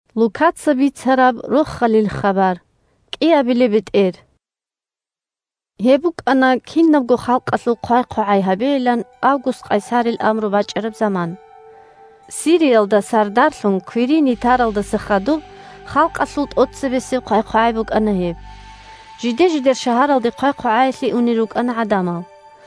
бетӀер Марямие Вас гьавула 1Гьеб букӀана кинабго халкъалъул хъвай-хъвагӀай гьабейилан Август къайсарил амру бачӀараб заман. 2Сириялда сардарлъун Квириний таралдаса хадуб халкъалъул тӀоцебесеб хъвай-хъвагӀай букӀана гьеб. Жиде-жидер шагьаралде хъвай-хъвагӀаялъе унел рукӀана гӀадамал.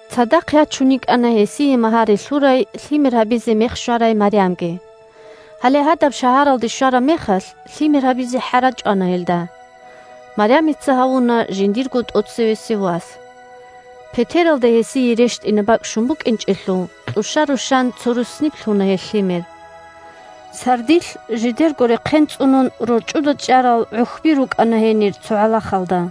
Цадахъ ячун йикӀана гьесие магьари лъурай, лъимер гьабизе мех щварай Марямги. Гьале гьадаб шагьаралде щвараб мехалъ, лъимер гьабизе хӀара чӀвана гьелда. Марямица гьавуна жиндирго тӀоцевесев вас. Петералда гьезие рещтӀине бакӀ щун букӀинчӀелъул, кьуща-рущан цо руссниб лъуна гьелъ лъимер. Сардилъ жидерго рехъен цӀунун рорчӀуда чӀарал гӀухьби рукӀана гьенир цо гӀалахалда.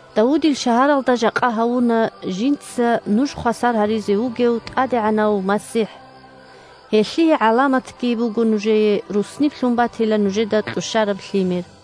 Давудил шагьаралда жакъа гьавуна жинца нуж хвасар гьаризе вугев ТӀадегӀанав МасихӀ. Гьелъие гӀаламатги буго нужее: руссниб лъун батила нужеда кьущараб лъимер.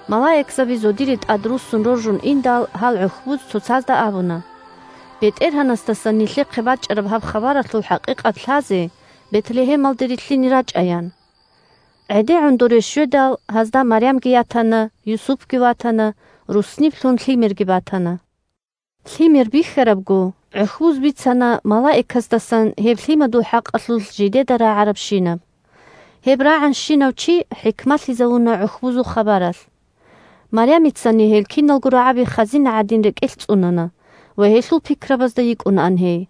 Малаикзаби зодире тӀадруссун роржун индал, гьал гӀухьбуз цоцазда абуна: – БетӀергьанасдасан нилъехъе бачӀараб гьаб хабаралъул хӀакъикъат лъазе, Бетлегьемалде рилълъине рачӀа, – ян. ГӀедегӀун доре щведал, гьазда Марямги ятана, Юсупги ватана, руссниб лъун Лъимерги батана. Лъимер бихьарабго, гӀухьбуз бицана малаикасдасан гьеб Лъимадул хӀакъалъулъ жидеда рагӀарабщинаб. Гьеб рагӀанщинав чи хӀикмалъизавуна гӀухьбузул хабаралъ. Марямицани гьел киналго рагӀаби хазина гӀадин рекӀелъ цӀунана, ва гьелъул пикрабазда йикӀунаан гьей.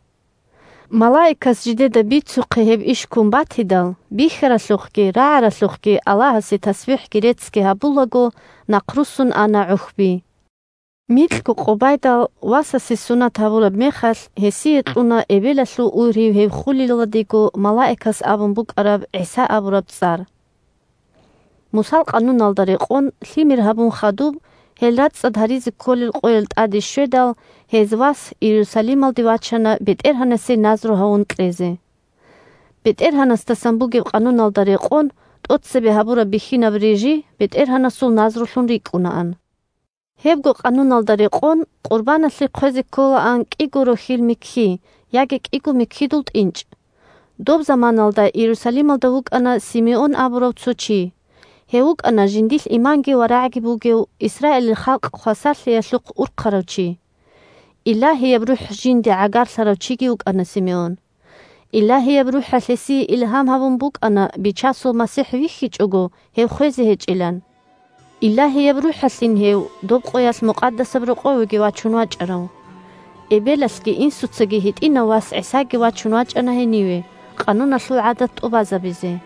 Малаикас жидеда бицухъе иш ккун батидал, бихьаралъухъги рагӀаралъухъги Аллагьасе тасбихӀги реццги гьабулаго нахъруссун ана гӀухьби. Микьго къо байдал, Васасе сунат гьабураб мехалъ, гьесие кьуна эбелалъул ургьив гьев хулилалдего малаикас абун букӀараб ГӀиса абураб цӀар. Мусал къануналда рекъон, лъимер гьабун хадуб гьел рацӀцӀад гьаризе кколел къоял тӀаде щведал, гьез Вас Иерусалималде вачана БетӀергьанасе назру гьавун кьезе. (БетӀергьанасдасан бугеб къануналда рекъон тӀоцебе гьабураб бихьинаб рижи БетӀергьанасул назрулъун рикӀкӀунаан.) Гьебго къануналда рекъон, къурбаналъе хъвезе кколаан кӀиго рохьил микки яги кӀиго миккидул тӀинчӀ. Доб заманаялда Иерусалималда вукӀана Симеон абурав цо чи. Гьев вукӀана жиндилъ иманги варагӀги бугев, Исраилил халкъ хвасарлъиялъухъ урхъарав чи. Илагьияб РухӀ жинде гӀагарлъарав чиги вукӀана Симеон. Илагьияб РухӀалъ гьесие илгьам гьабун букӀана Бичасул МасихӀ вихьичӀого гьев хвезе гьечӀилан. Илагьияб РухӀалъин гьев доб къоялъ Мукъадасаб Рокъовеги вачун вачӀарав. Эбелалъги инсуцаги гьитӀинав вас ГӀисаги вачун вачӀана гьениве, къануналъул гӀадат тӀубазабизе.